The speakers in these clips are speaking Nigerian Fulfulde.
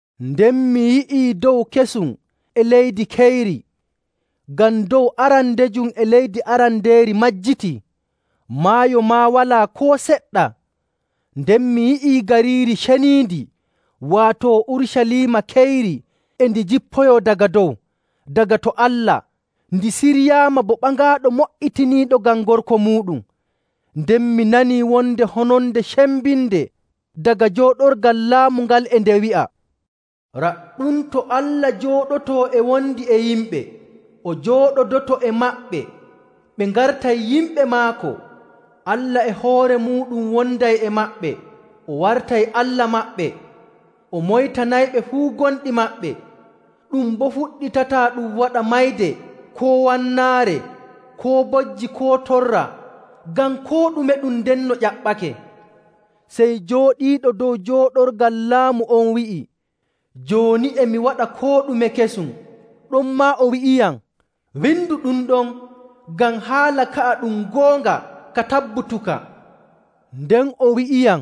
Nden mi yi'ii dow kesum e leydi keyri, ngam dow arandejum e leydi arandeeri majjitii, maayo maa walaa koo seɗɗa. Nden mi yi'ii Gariiri Ceniindi, waato Urucaliima keyri e ndi jippoyoo daga dow, daga to Allah, ndi siryaama bo ɓaŋaaɗo mo''itiniiɗo ngam gorko muuɗum. Nden mi nanii wonde hononde cembinde daga jooɗorgal laamu ngal e nde wi'a, “Raɗɗum to Allah jooɗotoo e wondi e yimɓe! O jooɗodoto e maɓɓe, ɓe ngartay yimɓe maako. Allah e hoore muuɗum wonday e maɓɓe, o wartay Allah maɓɓe. O moytanayɓe fuu gonɗi maɓɓe, ɗum boo fuɗɗitataa ɗum waɗa mayde koo wannaare koo bojji koo torra ngam koo ɗume ɗum ndenno ƴaɓɓake.” Sey jooɗiiɗo dow jooɗorgal laamu on wi'i, “Jooni e mi waɗa koo ɗume kesum!” Ɗonmaa o wi'iyam, “Windu ɗum ɗon, ngam haala ka'a ɗum goonga ka tabbutuka.” Nden o wi'iyam,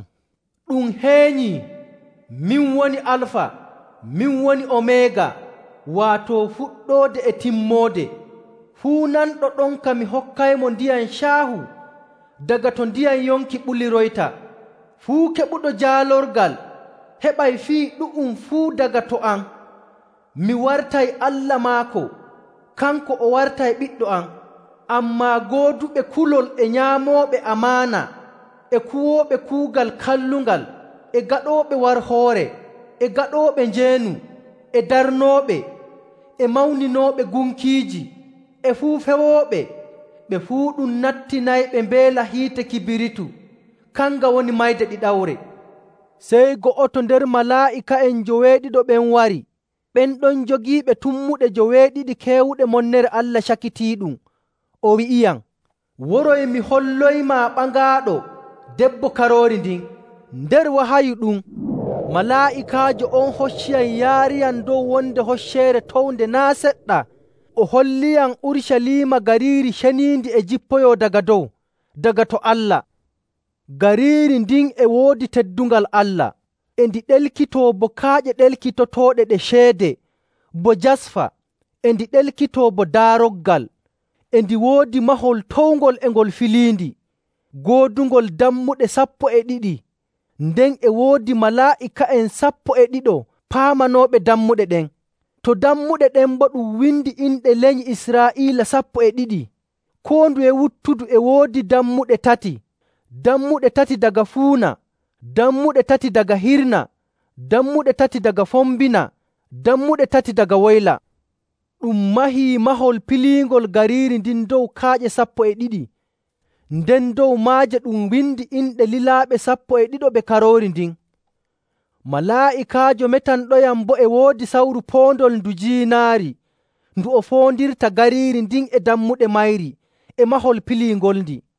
“Ɗum heenyii! Min woni Alfa, min woni Omeega, waato Fuɗɗoode e Timmoode. Fuu nanɗo ɗonka mi hokkaymo ndiyam caahu daga to ndiyam yonki ɓuliroyta. Fuu keɓuɗo jaalorgal heɓay fii ɗu'um fuu daga to am, mi wartay Allah maako, kanko o warta ɓiɗɗo am. Ammaa gooduɓe kulol e nyaamooɓe amaana, e kuwooɓe kuugal kallungal, e gaɗooɓe warhoore, e gaɗooɓe njeenu, e darnooɓe, e mawninooɓe gunkiiji, e fuu fewooɓe, ɓe fuu ɗum nattinayɓe mbeela hiite kibiritu, kanga woni mayde ɗiɗawre.” Sey go'oto nder malaa'ika'en njoweeɗiɗo ɓen wari, ɓen ɗon jogiiɓe tummuɗe joweeɗiɗi keewuɗe monnere Allah cakitiiɗum. O wi'iyam, “Woroy mi holloymaa ɓaŋaaɗo, debbo Karoori ndin.” Nder wahayu ɗum, malaa'ikaajo on hocciyam yaariyam dow wonde hocceere townde naa' seɗɗa o holliyam Urucaliima gariiri ceniindi e jippoyoo daga dow, daga to Allah. Gariiri ndin e woodi teddungal Allah e ndi ɗelkitoo bo kaaƴe ɗelkitotooɗe ɗe ceede, bo jasfa e ndi ɗelkitoo bo daaroggal. E ndi woodi mahol towngol e ngol filiindi, goodungol dammuɗe sappo e ɗiɗi, nden e woodi malaa'ika'en sappo e ɗiɗo paamanooɓe dammuɗe ɗen. To dammuɗe ɗen boo ɗum windii inɗe lenyi Israa'iila sappo e ɗiɗi. Koo nduye wuttudu e woodi dammuɗe tati, dammuɗe tati daga fuuna, dammuɗe tati daga hirna, dammuɗe tati daga fombina, dammuɗe tati daga woyla. Ɗum mahii mahol piliingol gariiri ndin dow kaaƴe sappo e ɗiɗi, nden dow maaje ɗum windii inɗe lilaaɓe sappo e ɗiɗo ɓe Karoori ndin. Malaa'ikaajo metanɗoyam boo e woodi sawru poondol ndu jiinaari ndu o foondirta gariiri ndin e dammuɗe mayri e mahol piliingolndi.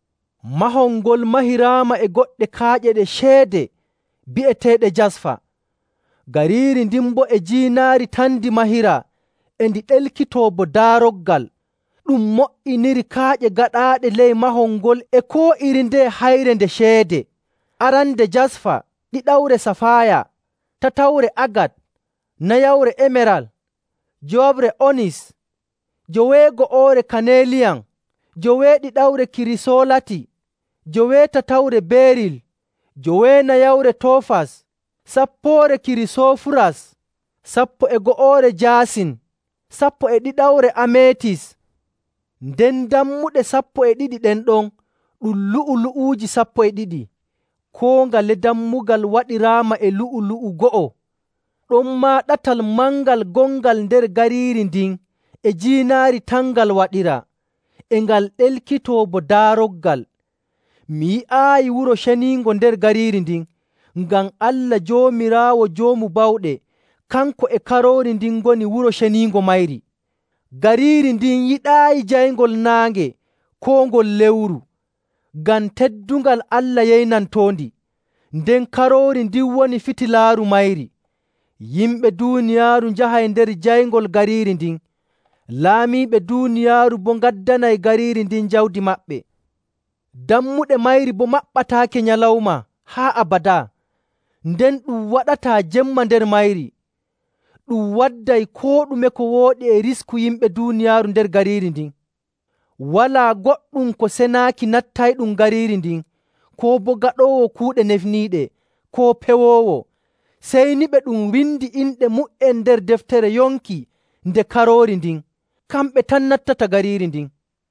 Mahol ngol mahiraama e goɗɗe kaaƴe ɗe ceede, bi'eteeɗe jasfa. Gariiri ndin boo e jiinaari tan ndi mahiraa e ndi ɗelkitoo bo daaroggal. Ɗum mo''inirii kaaƴe gaɗaaɗe ley mahol ngol e koo iri ndeye hayre nde ceede. Arande jasfa, ɗiɗawre safaaya, tatawre agat, nayawre emeral, njowaɓre onis, joweego'oore kaneeliyan, joweeɗiɗawre kirisoolati, joweetatawre beeril, joweenayawre toofas, sappoore kirisoofuras, sappo e go'oore jaasin, sappo e ɗiɗawre ameetis. Nden dammuɗe sappo e ɗiɗi ɗen ɗon ɗum lu'ulu'uuji sappo e ɗiɗi, koo ngale dammugal waɗiraama e lu'u‑lu'u go'o. Ɗonmaa ɗatal mangal gongal nder gariiri ndin e jiinaari tan ngal waɗiraa, e ngal ɗelkitoo bo daaroggal. Mi yi'aayi wuro ceniingo nder gariiri ndin, ngam Allah Joomiraawo Joomu Bawɗe kanko e Karoori ndin ngoni wuro ceniingo mayri. Gariiri ndin yiɗaayi jayngol naange koo ngol lewru, ngam teddungal Allah yeynantoondi, nden Karoori ndin woni fitilaaru mayri. Yimɓe duuniyaaru njahay nder jayngol gariiri ndin. Laamiiɓe duuniyaaru boo ngaddanay gariiri ndin jawdi maɓɓe. Dammuɗe mayri boo maɓɓataake nyalawma haa abadaa, nden ɗum waɗataa jemma nder mayri. Ɗum wadday koo ɗume ko wooɗi e risku yimɓe duuniyaaru nder gariiri ndin. Walaa goɗɗum ko senaaki nattayɗum gariiri ndin, koo boo gaɗoowo kuuɗe nefniiɗe, koo pewoowo. Sey ni ɓe ɗum windi inɗe mu''en nder deftere yonki nde Karoori ndin, kamɓe tan nattata gariiri ndin.